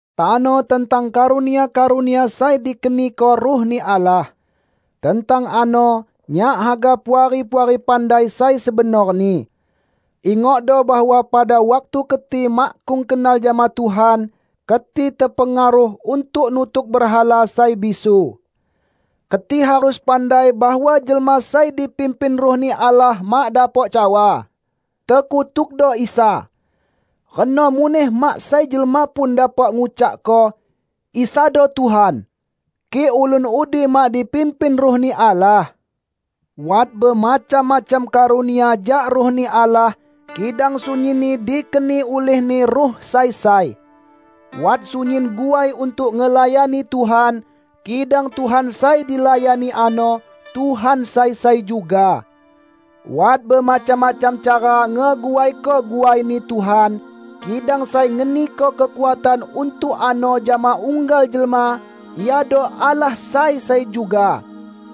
Tano tentang karunia-karunia sai dikeniko Ruh-Ni Allah. Tentang ano, nyak haga Puari-puari pandai sai sebenorni. Ingokdo bahwa pada waktu keti makkung kenal jama Tuhan, keti tepengaruh untuk nutuk berhala sai bisu. Keti harus pandai bahwa jelma sai dipimpin Ruh-Ni Allah mak dapok cawa, "Tekutukdo Isa!" Reno muneh mak sai jelma pun dapok ngucakko, "Isado Tuhan!" kik ulun udi mak dipimpin Ruh-Ni Allah. Wat bemacam-macam karunia jak Ruh-Ni Allah, kidang sunyinni dikeni ulih-Ni Ruh sai sai. Wat sunyin guai untuk ngelayani Tuhan, kidang Tuhan sai dilayani ano, Tuhan sai sai juga! Wat bemacam-macam cara ngeguaiko guaini Tuhan, kidang sai ngeniko kekuatan untuk ano jama unggal jelma iado Allah sai sai juga.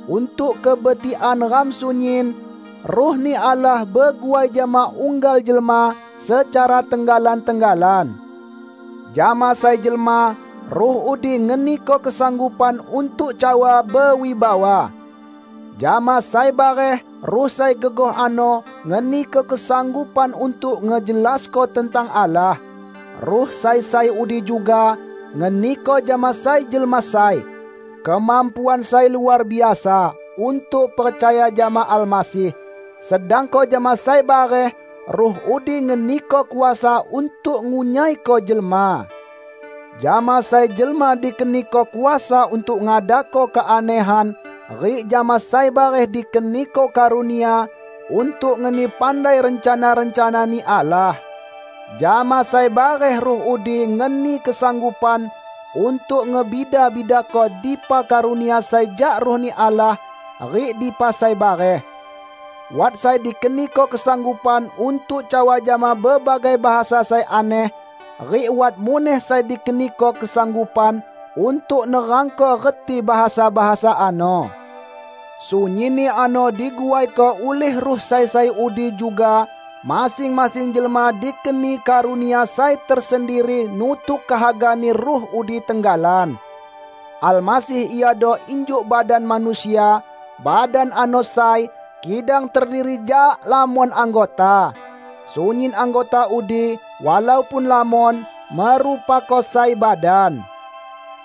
Untuk kebetikan ram sunyin, Ruh-Ni Allah beguai jama unggal jelma secara tenggalan-tenggalan. Jama sai jelma, Ruh udi ngeniko kesanggupan untuk cawa bewibawa. Jama sai bareh Ruh sai gegoh ano ngeniko kesanggupan untuk ngejelasko tentang Allah. Ruh sai sai udi juga ngeniko jama sai jelma sai, kemampuan sai luar biasa untuk percaya jama Almasih; sedangko jama sai bareh Ruh udi ngeniko kuasa untuk ngunyaiko jelma. Jama sai jelma dikeniko kuasa untuk ngadako keanehan rik jama sai bareh dikeniko karunia untuk ngeni pandai rencana-rencana-Ni Allah. Jama sai bareh Ruh udi ngeni kesanggupan untuk ngebida-bidako dipa karunia sai jak Ruh-Ni Allah rik dipa sai bareh. Wat sai dikeniko kesanggupan untuk cawa jama bebagai bahasa sai aneh, rik wat muneh sai dikeniko kesanggupan untuk nerangko reti bahasa-bahasa ano. Sunyinni ano diguaiko ulih Ruh sai sai udi juga; masing-masing jelma dikeni karunia sai tersendiri nutuk kehaga-Ni Ruh udi tenggalan. Almasih iado injuk badan manusia; badan ano sai, kidang terdiri jak lamon anggota. Sunyin anggota udi, walaupun lamon, merupako sai badan.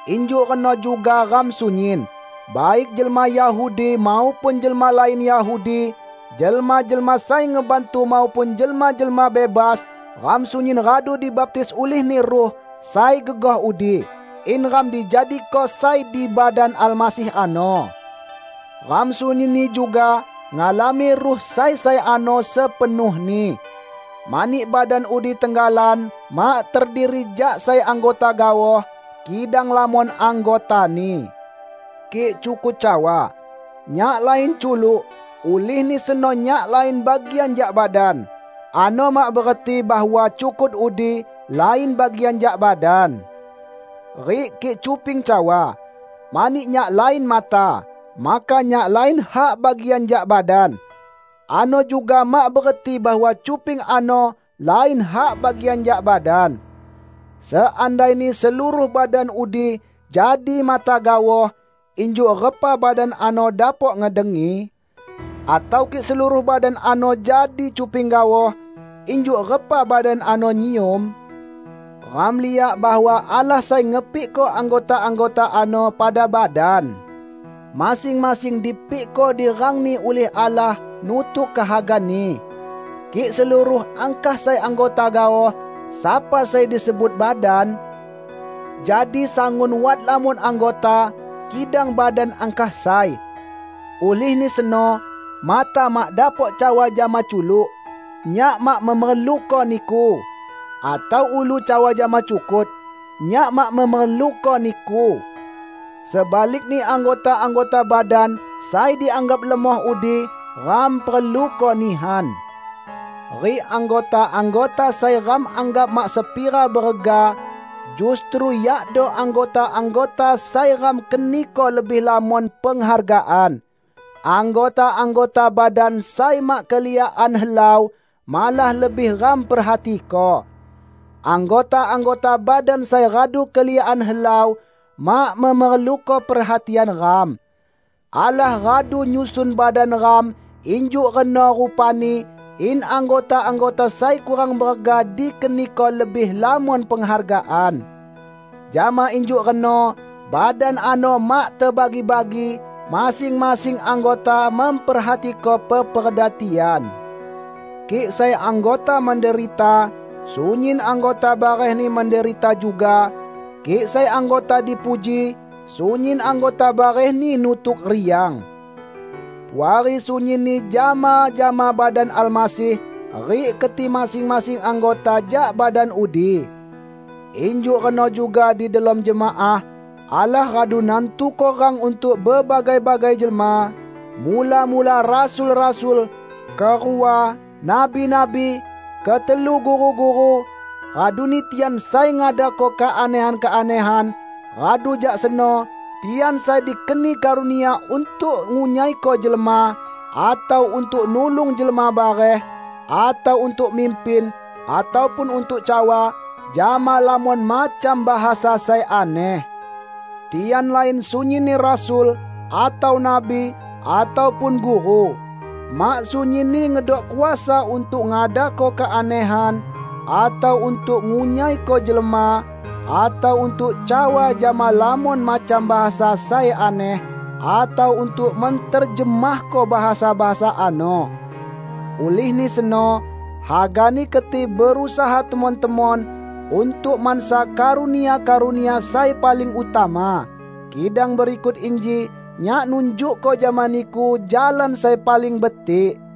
Injuk reno juga ram sunyin, baik jelma Yahudi maupun jelma lain Yahudi, jelma-jelma sai ngebantu maupun jelma-jelma bebas; ram sunyin radu dibaptis ulih-Ni Ruh sai gegoh udi, in ram dijadiko sai di badan Almasih ano. Ram sunyinni juga ngalami Ruh sai sai ano sepenuhni. Mani badan udi tenggalan mak terdiri jak sai anggota gaoh kidang lamon anggotani. Kik cukut cawa, "Nyak lain culuk, ulihni seno nyak lain bagian jak badan," ano mak bereti bahwa cukut udi lain bagian jak badan. Rik kik cuping cawa, "Mani nyak lain mata, maka nyak lain hak bagian jak badan," ano juga mak bereti bahwa cuping ano lain hak bagian jak badan. Seandaini seluruh badan udi jadi mata gaoh, injuk repa badan ano dapok ngedengi? Atau kik seluruh badan ano jadi cuping gaoh, injuk repa badan ano nyium? Ram liak bahwa Allah sai ngepikko anggota-anggota ano pada badan. Masing-masing dipikko di rangni ulih Allah nutuk kehaga-Ni. Kik seluruh angkah sai anggota gaoh, sapa sai disebut badan? Jadi sangun wat lamon anggota, kidang badan angkah sai. Ulihni seno, mata mak dapok cawa jama culuk, "Nyak mak memerluko niku!" atau ulu cawa jama cukut, "Nyak mak memerluko niku!" Sebalikni anggota-anggota badan sai dianggap lemoh udi, ram perluko nihan; rik anggota-anggota sai ram anggap mak sepira berega, justru yakdo anggota-anggota sai ram keniko lebih lamon penghargaan. Anggota-anggota badan sai mak keliakan helau, malah lebih ram perhatiko. Anggota-anggota badan sai radu keliakan helau, mak memerluko perhatian ram. Allah radu nyusun badan ram injuk reno rupani in anggota-anggota sai kurang berega dikeniko lebih lamon penghargaan. Jama injuk reno badan ano mak tebagi-bagi; masing-masing anggota memperhatiko peperda tian. Kik sai anggota menderita, sunyin anggota barehni menderita juga; kik sai anggota dipuji, sunyin anggota barehni nutuk riang. Puari sunyinni jama-jama badan Almasih rik keti masing-masing anggota jak badan udi. Injuk reno juga di delom jemaah, Allah radu nantuko rang untuk bebagai-bagai jelma: Mula-mula rasul-rasul; kerua, nabi-nabi, ketelu guru-guru, raduni tian sai ngadako keanehan-keanehan, radu jak seno tian sai dikeni karunia untuk ngunyaiko jelma, atau untuk nulung jelma bareh, atau untuk mimpin, ataupun untuk cawa jama lamon macam bahasa sai aneh. Tian lain sunyinni rasul, atau nabi, ataupun guru. Mak sunyinni ngedok kuasa untuk ngadako keanehan, atau untuk ngunyaiko jelma, atau untuk cawa jama lamon macam bahasa sai aneh, atau untuk menterjemahko bahasa-bahasa ano. Ulihni seno, hagani keti berusaha temon-temon untuk mansa karunia-karunia sai paling utama. Kidang berikut inji nyak nunjukko jama niku jalan sai paling betik.